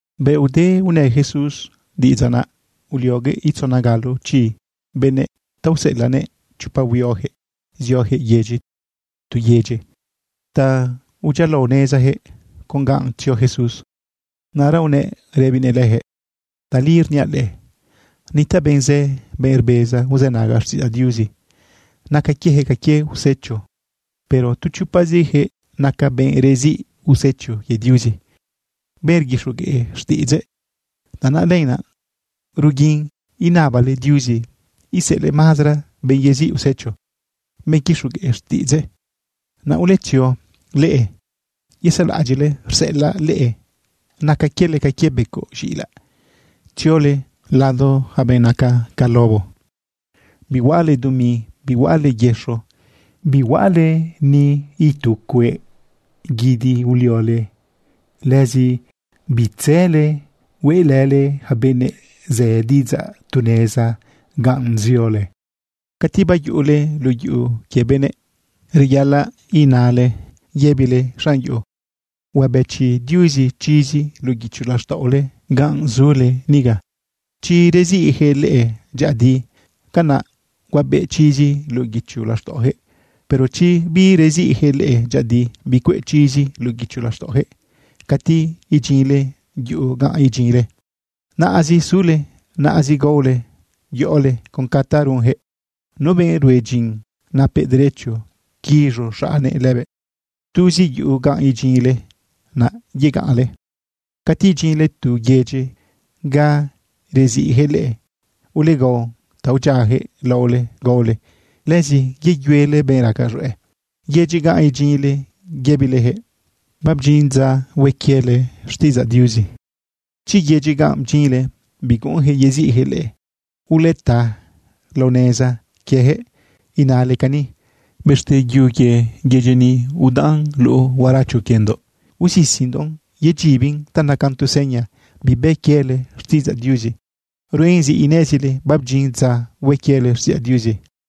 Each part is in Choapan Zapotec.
Bëꞌ ude unë Jesús diꞌidzaꞌ, naꞌ ulioguëꞌ itzona galo chi benëꞌ ta useꞌelaꞌnëꞌ chopa huioyaquëꞌ zioyaquëꞌ yedyi tu yedyi ta udyialaonezayaquëꞌ con ganꞌ tzio Jesús. Naꞌra unëꞌ rëbinëꞌ leyaquëꞌ: ―Tali rniaꞌ leꞌe, nitaꞌ benꞌ zë, benꞌ rbeza uzënaga xtiꞌidzaꞌ Diuzi, naca quieyaquëꞌ ca quie usecho. Pero tu chopaziyaquëꞌ naca benꞌ reziꞌ usecho quie Diuzi, benꞌ rguixogueꞌ xtiꞌidzëꞌ. Tanaꞌ lenaꞌ, ruguin inabale Diuzi iseꞌelëꞌ mazara benꞌ yeziꞌ usecho, benꞌ quixogueꞌ xtiꞌidzëꞌ. Naꞌ uletzio leꞌe. Yezaꞌlaꞌadyiꞌle rseꞌelaꞌ leꞌe naca quiele ca quie becoꞌ z̃iꞌilaꞌ tziole lado yaca benꞌ naca ca lobo. Bihuaꞌale dumi, bihuaꞌale yëxo, bihuaꞌale ni itu cueꞌ guidi uliole. Lëzi bitzële hueꞌlële yaca benëꞌ zë diꞌidzaꞌ tu neza ganꞌ ziole. Cati bayuꞌule luꞌu yuꞌu quie benëꞌ, reyaꞌalaꞌ inale yëbile xanꞌ yuꞌu: “Huabëchi Diuzi chizi luꞌu guicho laxtaꞌole ganꞌ zule niga.” Chi reziꞌyaquëꞌ leꞌe dyëꞌëdi, canaꞌ huabeꞌ chizi luꞌu guicho laxtaꞌoyaquëꞌ. Pero chi bireziꞌyaquëꞌ leꞌe dyëꞌëdi, bicueꞌ chizi luꞌu guicho laxtaꞌoyaquëꞌ. Cati idyinle yuꞌu ganꞌ idyinle, naꞌazi sule, naꞌazi gaole yoꞌole con ta runyaquëꞌ. Nu benꞌ rue dyin, napëꞌ derecho quiz̃u xaꞌnnëꞌ lëbëꞌ. Tuzi yuꞌu ganꞌ idyinle naꞌ yegaꞌnle. Cati idyinle tu yedyi ga reziꞌyaquëꞌ leꞌe, ulegao ta udyiayaquëꞌ laole gaole. Lëzi yeyuele benꞌ raca z̃hueꞌ yedyi ganꞌ idyinle yëbileyaquëꞌ: “Babdyin dza hue quiele xtiꞌidzaꞌ Diuzi.” Chi yedyi ganꞌ bdyinle biguꞌunyaquëꞌ yeziꞌyaquëꞌ leꞌe, uleta lao neza quieyaquëꞌ inale cani: “Bëxte yu quie yedyi ni udaꞌn luꞌu huaracho quiendoꞌ, usisindoꞌn yedyibin ta nacan tu seña bibë quiele xtiꞌidzaꞌ Diuzi. Ruen zi inezile babdyin dza hue quiele xtiꞌidzaꞌ Diuzi.”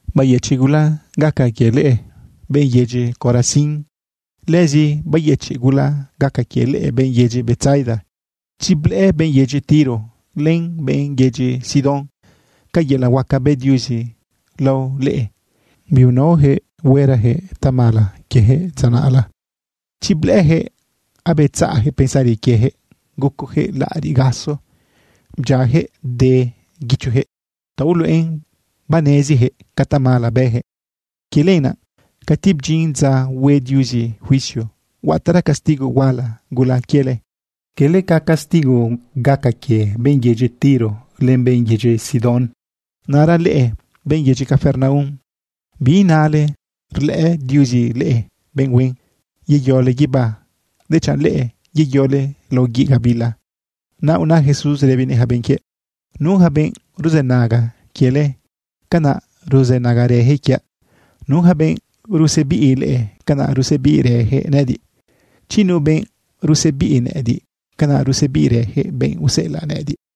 ―¡Bayëchiꞌ gula gaca quie leꞌe, benꞌ yedyi Corazín! ¡Lëzi bayëchiꞌ gula gaca quie leꞌe, benꞌ yedyi Betsaida! Chi blëꞌë benꞌ yedyi Tiro len benꞌ yedyi Sidón ca yelaꞌ huaca bë Diuzi lao leꞌe, biunaoyaquëꞌ huerayaquëꞌ tamala quieyaquëꞌ dza naꞌla. Chi blëꞌëyaquëꞌ, abetzaꞌyaquëꞌ pensari quieyaquëꞌ, gucoyaquëꞌ laꞌariꞌ gaso, bdyiayaquëꞌ de guichoyaquëꞌ ta uluꞌen baneziyaquëꞌ ca tamala bëyaquëꞌ. Quie lenaꞌ, cati bdyin dza hue Diuzi juicio, huataꞌra castigo huala gula quiele, cala ca castigo gaca quie benꞌ yedyi Tiro len benꞌ yedyi Sidón. Naꞌra leꞌe, benꞌ yedyi Capernaum, biinale rlëꞌë Diuzi leꞌe benꞌ huen yeyole guibá, dechanꞌ leꞌe yeyole lao guiꞌ gabila. Naꞌ una Jesús rëbinëꞌ yaca benꞌ quiëꞌ: ―Nu yaca benꞌ ruzënaga quiele, canaꞌ ruzënagarëyaquëꞌ quiaꞌ. Nu yaca benꞌ rusebiꞌ leꞌe, canaꞌ rusebiꞌrëyaquëꞌ nëꞌëdiꞌ. Chi nu benꞌ rusebiꞌ nëꞌëdiꞌ, canaꞌ rusebiꞌrëyaquëꞌ benꞌ useꞌelaꞌ nëꞌëdiꞌ.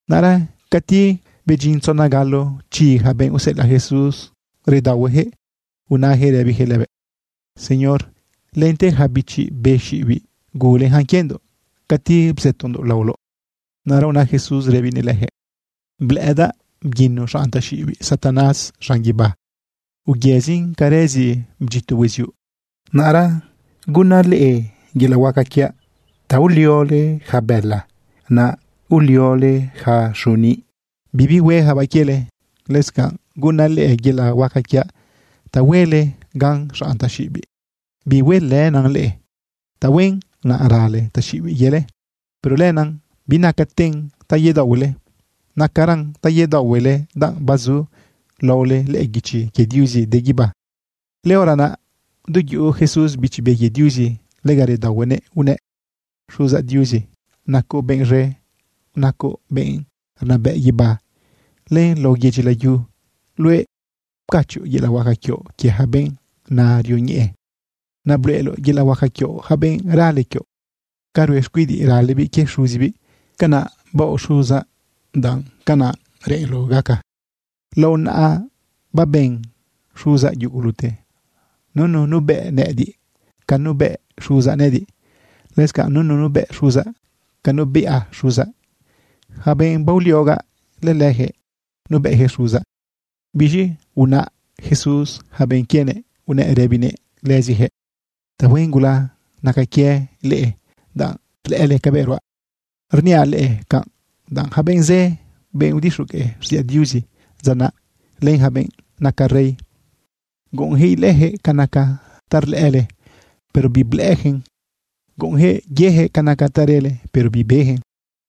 Naꞌra cati bedyin tzona galo chi yaca benꞌ useꞌelaꞌ Jesús, redaohueyaquëꞌ unayaquëꞌ rëbiyaquëꞌ lëbëꞌ: ―Señor, lente yaca bichi be xiꞌibiꞌ guleyacan quiendoꞌ cati bzëtondoꞌ laoloꞌ. Naꞌra una Jesús rëbinëꞌ leyaquëꞌ: ―Blëꞌëdaꞌ bguino xanꞌ taxiꞌibiꞌ Satanás z̃an guibá, uyëzin ca rëzi bdyito hueziuꞌ. Naꞌra gunaꞌ leꞌe yelaꞌ huaca quiaꞌ ta nuliole yaca bëla, naꞌ nuliole yaca xuniꞌ, bibi hueyacabaꞌ quiele. Lëscanꞌ gunaꞌ leꞌe yelaꞌhuaca quiaꞌ ta huele gan xanꞌ taxiꞌibiꞌ bihuelënan leꞌe. Tahuen naꞌ rale yaca taxiꞌibiꞌ quiele. Pero lenaꞌ binacaten ta yedaohuele. Nacaran ta yedaohuele danꞌ bazu laole lëꞌë guichi quie Diuzi de guibá. Lëhora naꞌ, du yuꞌu Jesús Bichi Be quie Diuzi, lega redaohuenëꞌ unëꞌ: ―Xuzaꞌ Diuzi, nacoꞌ benꞌ z̃e, nacoꞌ benꞌ rnabëꞌ guibá len lao yedyi layu. Luëꞌ pcachoꞌ yelaꞌ huaca quioꞌ quie yaca benꞌ na rioñeꞌe. Naꞌ bluꞌeloꞌ yelaꞌ huaca quioꞌ yaca benꞌ rale quioꞌ ca rue xcuidiꞌ ralebiꞌ quie xuzibiꞌ. Canaꞌ baoꞌ xuzaꞌ, danꞌ canaꞌ reꞌenloꞌ gaca. ’Lao naꞌa babën xuzaꞌ yugulute. Nunu nuebëꞌ nëꞌëdiꞌ ca nuebëꞌ xuzaꞌ nëꞌëdiꞌ. Lëscanꞌ nunu nuebëꞌ xuzaꞌ ca nuebiꞌa xuzaꞌ. Yaca benꞌ baoliogaꞌ, lëleyaquëꞌ nuebëꞌyaquëꞌ xuzaꞌ. Biz̃i unaꞌ Jesús yaca benꞌ quienëꞌ, unëꞌ rëbinëꞌ lëziyaquëꞌ: ―Tahuen gula naca quie leꞌe, danꞌ rlëꞌële cabëꞌ ruaꞌ. Rniaꞌ leꞌe canꞌ, danꞌ yaca benꞌ zë, benꞌ udixogueꞌ xtiꞌidzaꞌ Diuzi dza naꞌ, len yaca benꞌ naca rey, guꞌunyaquëꞌ ilëꞌëyaquëꞌ ca naca ta rlëꞌële, pero biblëꞌëyaquëꞌ. Guꞌunyaquëꞌ yeyaquëꞌ ca naca ta rele, pero bibeyaquëꞌ.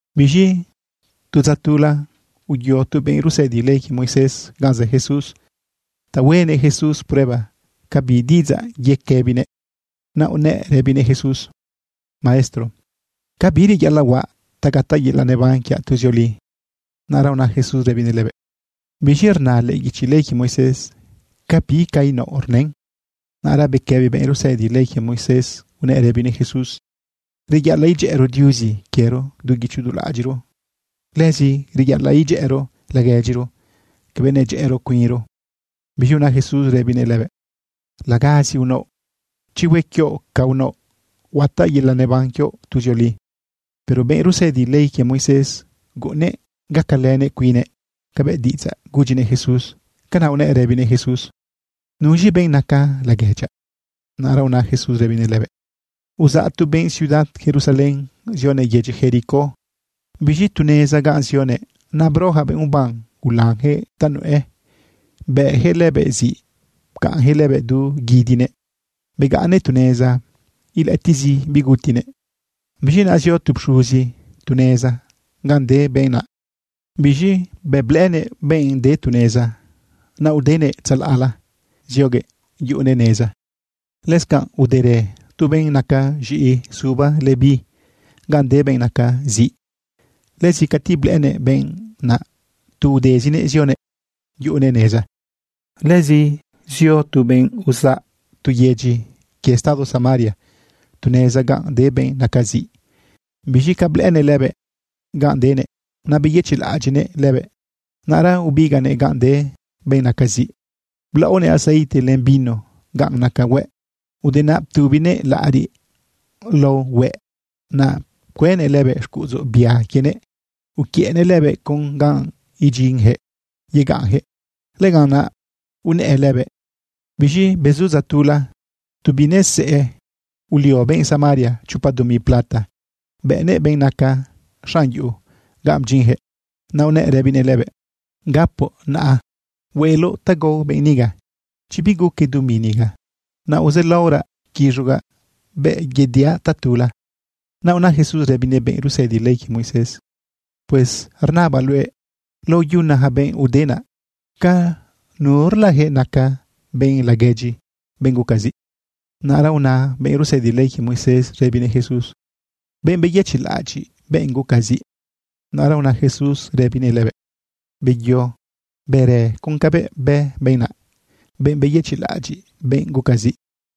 Biz̃i tu dza tula, uyo tu benꞌ rusëdi ley quie Moisés ganꞌ zë Jesús ta huenëꞌ Jesús prueba ca bi diꞌidzaꞌ yequëbinëꞌ. Naꞌ unëꞌ rëbinëꞌ Jesús: ―Maestro, ¿ca bi reyaꞌalaꞌ huaꞌ ta gataꞌ yelaꞌ neban quiaꞌ tuzioli? Naꞌra una Jesús rëbinëꞌ lëbëꞌ: ―¿Biz̃i rna lëꞌë guichi ley quie Moisés? ¿Ca bi ca inaoꞌ rnën? Naꞌra bequëbi benꞌ rusëdi ley quie Moisés unëꞌ rëbinëꞌ Jesús: ―“Reyaꞌalaꞌ idyëꞌëro Diuzi quiero du guicho du laꞌadyiꞌro. Lëzi reyaꞌalaꞌ idyëꞌëro laguedyiro cabëꞌ nedyëꞌëro cuinro.” Biz̃i una Jesús rëbinëꞌ lëbëꞌ: ―Lagazi unaoꞌ. Chi hue quioꞌ ca unaoꞌ, huataꞌ yelaꞌ neban quioꞌ tuzioli. Pero benꞌ rusëdi ley quie Moisés, guꞌunnëꞌ gacalënëꞌ cuinnëꞌ cabëꞌ diꞌidzaꞌ gudyinëꞌ Jesús. Canaꞌ unëꞌ rëbinëꞌ Jesús: ―¿Nuz̃i benꞌ naca laguedyaꞌ? Naꞌra una Jesús rëbinëꞌ lëbëꞌ: ―Uzaꞌ tu benꞌ ciudad Jerusalén zionëꞌ yedyi Jericó. Biz̃i tu neza ganꞌ zionëꞌ, naꞌ bro yaca benꞌ uban ulanyaquëꞌ ta nuꞌë. Bëꞌyaquëꞌ lëbëꞌ ziꞌ, pcaꞌnyaquëꞌ lëbëꞌ du guidinëꞌ. Begaꞌnnëꞌ tu neza, ilëꞌëtiꞌzi bigutinëꞌ. Biz̃i naꞌ zio tu pxuzi tu neza ganꞌ de benꞌ naꞌ. Biz̃i bëꞌ blëꞌënëꞌ benꞌ de tu neza, naꞌ udenëꞌ tzalaꞌla zioguëꞌ yuꞌunëꞌ neza. Lëscanꞌ uderë tu benꞌ naca z̃iꞌi suba Leví ganꞌ de benꞌ naca ziꞌ. Lëzi cati blëꞌënëꞌ benꞌ naꞌ, tu udezinëꞌ zionëꞌ yuꞌunëꞌ neza. Lëzi zio tu benꞌ uzaꞌ tu yedyi quie estado Samaria tu neza ganꞌ de benꞌ naca ziꞌ. Biz̃i ca blëꞌënëꞌ lëbëꞌ ganꞌ denëꞌ, naꞌ beyëchiꞌlaꞌadyiꞌnëꞌ lëbëꞌ. Naꞌra ubigaꞌnëꞌ ganꞌ de benꞌ naca ziꞌ, blaꞌonëꞌ aceite len vino ganꞌ naca hueꞌ. Ude naꞌ ptubinëꞌ laꞌariꞌ lao hueꞌ. Naꞌ pcuënëꞌ lëbëꞌ xcuꞌudzu bia quienëꞌ uquiëꞌnëꞌ lëbëꞌ con ganꞌ idyinyaquëꞌ yegaꞌnyaquëꞌ. Lëganꞌ naꞌ unëꞌë lëbëꞌ. Biz̃i bezu dza tula, tu binesëꞌë, ulio benꞌ Samaria chopa dumi plata bëꞌnëꞌn benꞌ naca xanꞌ yuꞌu ganꞌ bdyinyaquëꞌ. Naꞌ unëꞌ rëbinëꞌ lëbëꞌ: “Gapoꞌ naꞌ hueꞌloꞌ ta gao benꞌ niga. Chi biguque dumi niga, naꞌ aozaꞌlaoraꞌ quiz̃ugaꞌ bëꞌ yediaꞌ tatula.” Naꞌ una Jesús rëbinëꞌ benꞌ rusëdi ley quie Moisés: ―Pues rnabaꞌ luëꞌ, lao yuna yaca benꞌ ude naꞌ, ¿ca nurlayaquëꞌ naca benꞌ laguedyi benꞌ guca ziꞌ? Naꞌra una benꞌ rsëdi ley quie Moisés rëbinëꞌ Jesús: ―Benꞌ beyëchiꞌlaꞌadyiꞌ benꞌ guca ziꞌ. Naꞌra una Jesús rëbinëꞌ lëbëꞌ: ―Beyo, bërë con cabëꞌ bë benꞌ naꞌ, benꞌ beyëchiꞌlaꞌadyiꞌ benꞌ guca ziꞌ.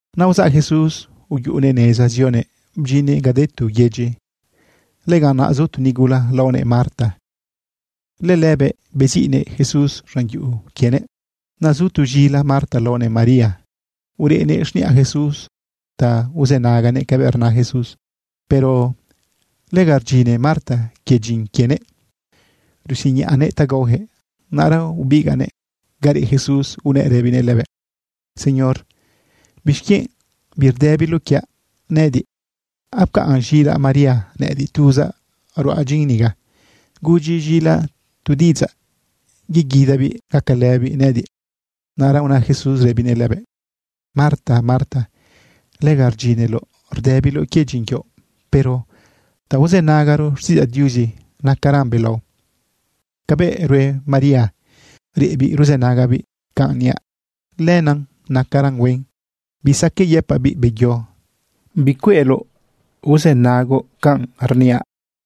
Naꞌ uzaꞌ Jesús uyuꞌunëꞌ neza zionëꞌ bdyinnëꞌ ga de tu yedyi. Lëganꞌ naꞌ zu tu nigula laonëꞌ Marta. Lëlëbëꞌ beziꞌnëꞌ Jesús z̃an yuꞌu quienëꞌ. Naꞌ zu tu z̃ila Marta laonëꞌ María. Ureꞌnëꞌ xniꞌa Jesús ta uzënaganëꞌ cabëꞌ rna Jesús. Pero lega rdyine Marta quie dyin quienëꞌ rusiñaꞌnëꞌ ta gaoyaquëꞌ. Naꞌra ubigaꞌnëꞌ ga reꞌ Jesús unëꞌ rëbinëꞌ lëbëꞌ: ―Señor, ¿bixquienꞌ birdëbiloꞌ quiaꞌ nëꞌëdiꞌ? Apcaꞌn z̃ilaꞌ María nëꞌëdiꞌ. Tuzaꞌ ruaꞌ dyin niga. Gudyi z̃ilaꞌ tu diꞌidzaꞌ yeguidabiꞌ gacalëbiꞌ nëꞌëdiꞌ. Naꞌra una Jesús rëbinëꞌ lëbëꞌ: ―Marta, Marta, lega rdyineloꞌ rdëbiloꞌ quie dyin quioꞌ. Pero ta uzënagaro xtiꞌidzaꞌ Diuzi nacaran belao. Cabëꞌ rue María, reꞌbiꞌ ruzënagabiꞌ canꞌ niaꞌ, lenaꞌ nacaran huen. Bisaqueꞌ yëpaꞌbiꞌ: “Beyo, bicueꞌloꞌ rzënagoꞌ canꞌ rniaꞌ.”